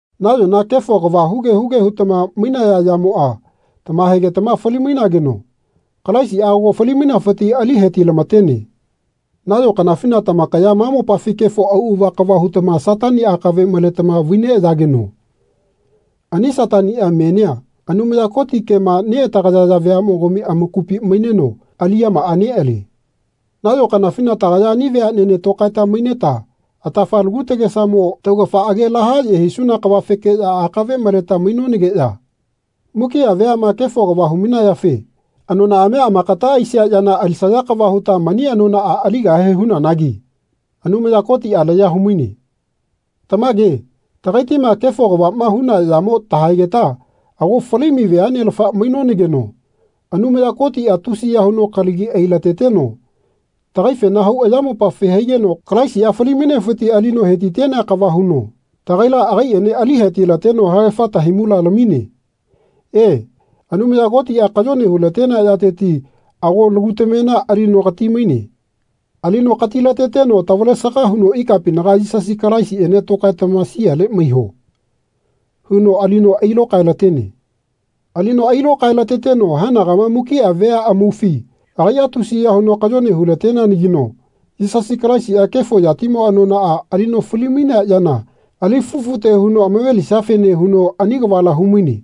Nayona kefo kava huge huge hutama mainaya yamoa tamahaegetama fali-mainageno Kalaisia ago fali-mainafiti ali hetilamatene. Nayo kanafina tamakaya ma mopafi kefo auava kava hutama Satani akave maletama vai neayageno ani Satania menia Anumaya Koti kema neatagayaya veamogami amakupi maineno aliyamaa nealie. Nayo kanafina tagaya ani veanene tokaeta maineta atafa lagu tagesamo taugafa age lahaye hisuna kavafekeya akave maleta mainonageya mukia veama kefo kava humainayafe anonaamia amakata aisia yana alisaya kava huta mani anonaa aligahe hunanagi Anumaya Kotia laya humaine. Tamage tagaitima kefo kavama huna yamo tahaegeta ago fali-mai veanelafa mainonageno Anumaya Kotia tusiya huno kalagi ailateteno tagaifena hau ayamopafi haigeno Kalaisia fali-mainefiti alino hetitenea kava huno tagaila agaiene alihetilateno haegafa tahaimula lamine. E, Anumaya Kotia kayone hulatenea yateti ago lagu tamena alino katimaine. Alino katilateteno tavalesaga huno ikapinaga Yisasi Kalaisiene tokaetama siale maiho. huno alino ailokaelatene. Alino ailokaelateteno haenagama mukia vea amaufi agaia tusiya huno kayone hulateneanagino Yisasi Kalaisia kefo yatimo anonaa alino fali-mainea yana ali fufute huno amave-lisiafene huno ani kavala humaine.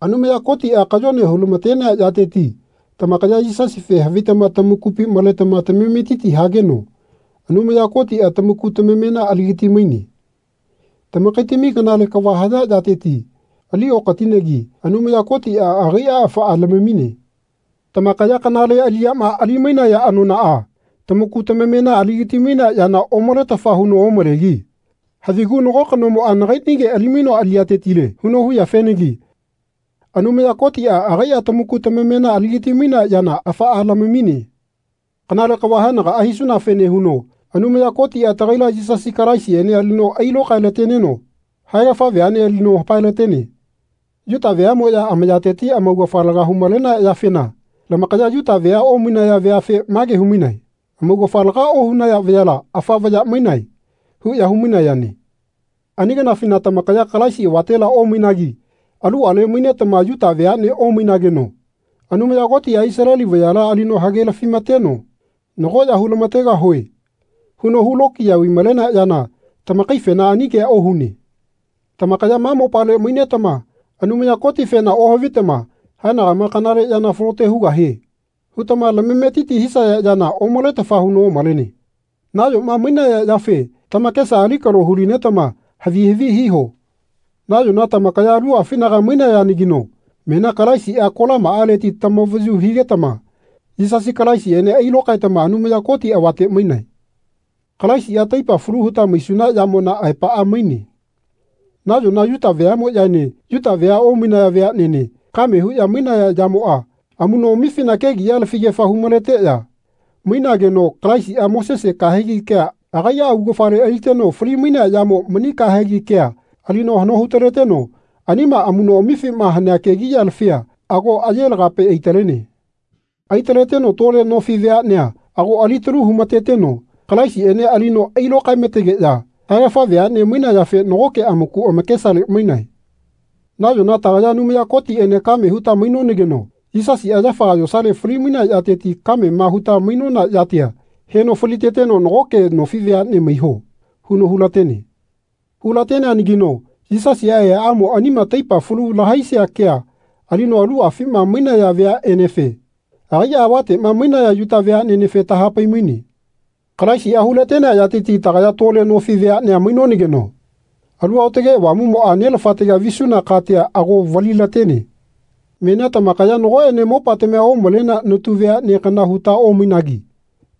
Anumaya Kotia kayone hulamatenea yateti tamakaya Yisasife havitama tamakupi maletama tamametiti hageno Anumaya Kotia tamaku tamamena aligati-maine. Tamakaitami kanale kava haya yateti aliokatinegi Anumaya Kotia agaia afaa lamamine. Tamakaya kanale aliyama ali-mainaya anonaa tamaku tamamena aligati-mainea yana omaletafa huno omalegi havigu nago kanomoa Nagainige alimainoa aliyatetile. huno huyafenagi Anumaya Kotia agaia tamaku tamamena aligati-mainea yana afaa lamamine. Kanale kava haenagaa hisunafene huno Anumaya Kotia tagaila Yisasi Kalaisiene alino ailokaelateneno haegafa veane alino hapae-latene. Yuta veamoya amayateti amaugafa laga humalenaya yafena lamakaya Yuta vea omainaya veafe mage humainae Amaugafa laga ohunaya vayala, afa vaya, mainae. huya humainayane. Ani kanafina tamakaya Kalaisi avatela omainagi aluale mainetama Yuta veanea omainageno Anumaya Kotia Isaleli vayala alino hagelafi-mateno Nago ya hu-lamategahue. huno hulokiya vaimalenea yana tamakaifena ani kea ohune. Tamakaya ma mopale mainetama Anumaya Kotifena ohavitama Haenagama kanale yana falote hugahie. hutama lamametiti hisaya yana omaletafa huno omalene. Nayoma mainaya yafe tamakesa alikalo hulinetama havi havi hiho. Nayona tamakaya aluafinaga mainayanagino menia Kalaisia kolamaaleti tamavayu higetama Yisasi Kalaisiene ailokaetama Anumaya Koti avate mainae. Kalaisia taipa falu huta maisuna yamona aepaa maine. Nayona Yuta veamoyaene Yuta vea omainaya veanene kame huya mainaya yamoa amunoamifina kegiya lafigefa humaleteya mainageno Kalaisia Mosesi kahegi kea agaia augafale aliteno fali-mainea yamo mani kahegi kea alino hano hutaleteno anima amunoamifima hanea kegiya lafia ago aye lagape aitalene. Aitaleteno tole nofi veanea ago alitalu humateteno Kalaisiene alino ailokaemategeya haegafa veane mainayafe nagoke amaku amakesale mainae. Nayona tagaya Anumaya Kotiene kame huta mainonageno Yisasia yafaga yosale fali-mainea yateti kamema huta mainona yatia heno faliteteno Nagoke nofi veane maiho. huno hulatene. Hu-lateneanagino Yisasia eaamo anima taipa falu lahaisia kea alino aluafima mainaya veaenefe agaia avatema mainaya Yuta veanenefe tahapai-maine. Kalaisia hulatenea yateti tagaya tole nofi veanea mainonageno Alu Aotage Avamumoa Nelafatega visuna katia ago vali-latene. Menia tamakaya nagoene mopatamia omalenea natu veane kana huta omainagi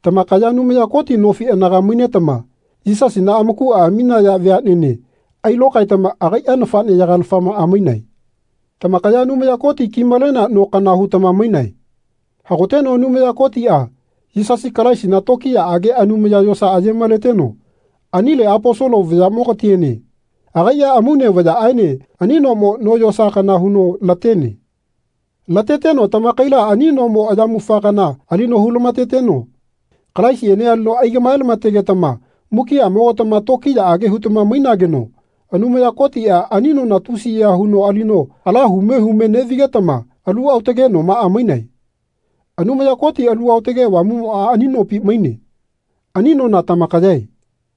tamakaya Anumaya Koti nofi anaga mainetama Yisasina amakua aminaya veanene ailokaetama agaia nafaneyaga-lafamaa mainae. Tamakaya Anumaya Koti kimalenea no kana hutama mainae. Hagoteno Anumaya Kotia Yisasi Kalaisina tokiyaage anumaya yosa aye-maleteno anile Aposolo vayamogatiene agaia amaune vayaene ani nomo no yosa kana huno latene. Lateteno tamakaila ani nomo ayamufa kana alino hu-lamateteno Kalaisiene alino aigamae-lamategetama mukiamogatama tokiyaage hutama mainageno Anumaya Kotia ani nona tusiya huno alino ala hume hume nevigetama alu aotage nomaa mainae. Anumaya Koti Alu Aotage Avamumoa ani nopi maine. Ani nona tamakayae.